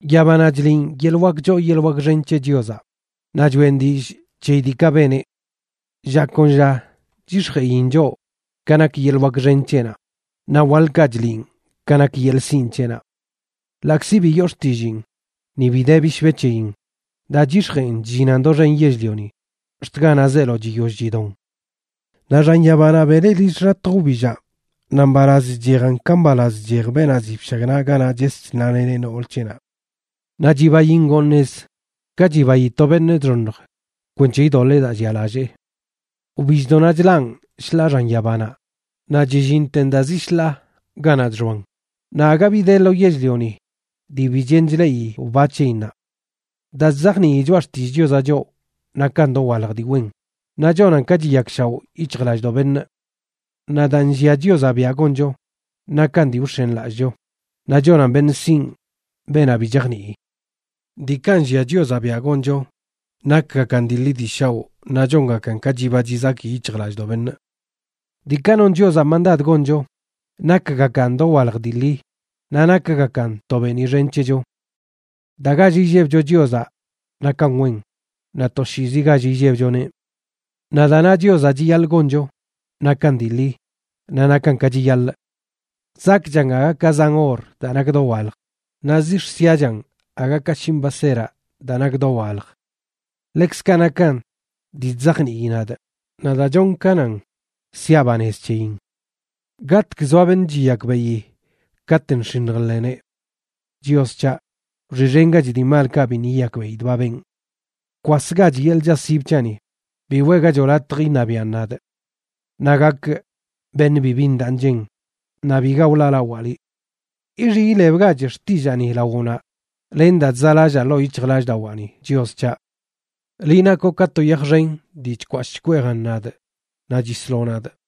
Yabanaꞌ chliꞌn yeḻꞌ wak choo yeḻꞌ wak xen c̱he Chiozaꞌ, naꞌ choꞌen dillꞌ c̱heyi diikaꞌ beneꞌ. Lla kon lla chyix̱jeꞌin choꞌ ka nak yeḻꞌ wak xen c̱heꞌnaꞌ, naꞌ waḻkaꞌ chliꞌn ka nak yeḻꞌ sinꞌ c̱heꞌnaꞌ. Ḻaꞌkzi bi yoo xtilliin, ni bi de bishbe c̱heyin, daa chyix̱jeꞌn chllinan doxen yell-lioni ax̱t ganaꞌ zeelo chiyoll chidon. Naꞌ xan yabanaꞌ beneꞌ lill xḻatj wbillaꞌ, naꞌ mbalaz chchejan ka mbalaz chchej beenaꞌ ziꞌ bshagnaꞌ ganaꞌ ches chnaleneꞌ nool c̱heꞌnaꞌ. Naꞌ chibain ngoon nez ka chibayi to beṉꞌ chxoṉj kwenc̱he idoḻee daa llialallee. Wbilldoꞌnaꞌ chlaꞌn shḻaa xan yabanaꞌ, naꞌ chillinten daa zi shḻaa ganaꞌ chxoan, naꞌ aga bi de lo yell-lioni dii bi chen chleꞌi wba c̱heyinnaꞌ. Daa chzajnii choꞌa xtillꞌ Chiozaꞌ choꞌ nakan dowalj dii wen, naꞌ chonan ka chiyakshaoꞌ yic̱hjlallꞌdoꞌ beṉꞌ. Naꞌ daa nllia Chiozaꞌ biaꞌ goncho nakan dii wx̱enlallꞌcho, naꞌ chonan beṉꞌ sinꞌ beenaꞌ bi chajnii. Diikaꞌ nllia Chiozaꞌ biaꞌ goncho nakgakan dii ḻi dii shaoꞌ, naꞌ chongakan ka chiba chizaki yic̱hjlallꞌdoꞌ beṉꞌ. Diikaꞌ non Chiozaꞌ mandad goncho nakgakan dowalj dii ḻi, naꞌ nakgakan to beeniꞌ xen c̱hecho. Daa gall illebcho Chiozaꞌ nakan wen, naꞌ toshiizi gall illebchoneꞌ. Naꞌ daa na Chiozaꞌ chiyaḻꞌ goncho, nakan dii ḻi, naꞌ nakan ka chiyaḻꞌ. Zakꞌchan aga ka zan or daa nak dowalj, naꞌ zix̱ siachan aga ka shinꞌ baseraꞌ daa nak dowalj. Ḻekzkaꞌ nakan dii chzajnii nadꞌ; naꞌ daa chonꞌ ka nan, siaꞌ banez c̱heyin. ¿Gatg zoa beṉꞌ chiyakbeꞌi katꞌ nx̱iṉj nḻeneꞌ? Chios c̱haꞌ, wxiꞌxengach dii malkaꞌ biṉꞌ yiyakbeꞌidꞌ ba benꞌ. Bkwasgach yeḻꞌ chaꞌsib c̱haꞌni, bi weꞌgachoꞌ latj iṉabiaꞌn nadꞌ. Naꞌ gakꞌ beṉꞌ bibi ndaꞌ nchen, naꞌ biga wḻaalawaa liꞌ. Ixiꞌ ilebgach xtillaani lawoꞌnaꞌ len daa chzaꞌlallaa ḻoo yic̱hjlallꞌdawaani, Chios c̱haꞌ. Liꞌ nakoꞌ ka to yaj xen dii chkwashꞌ chkweejan nadꞌ naꞌ chisloꞌ nadꞌ.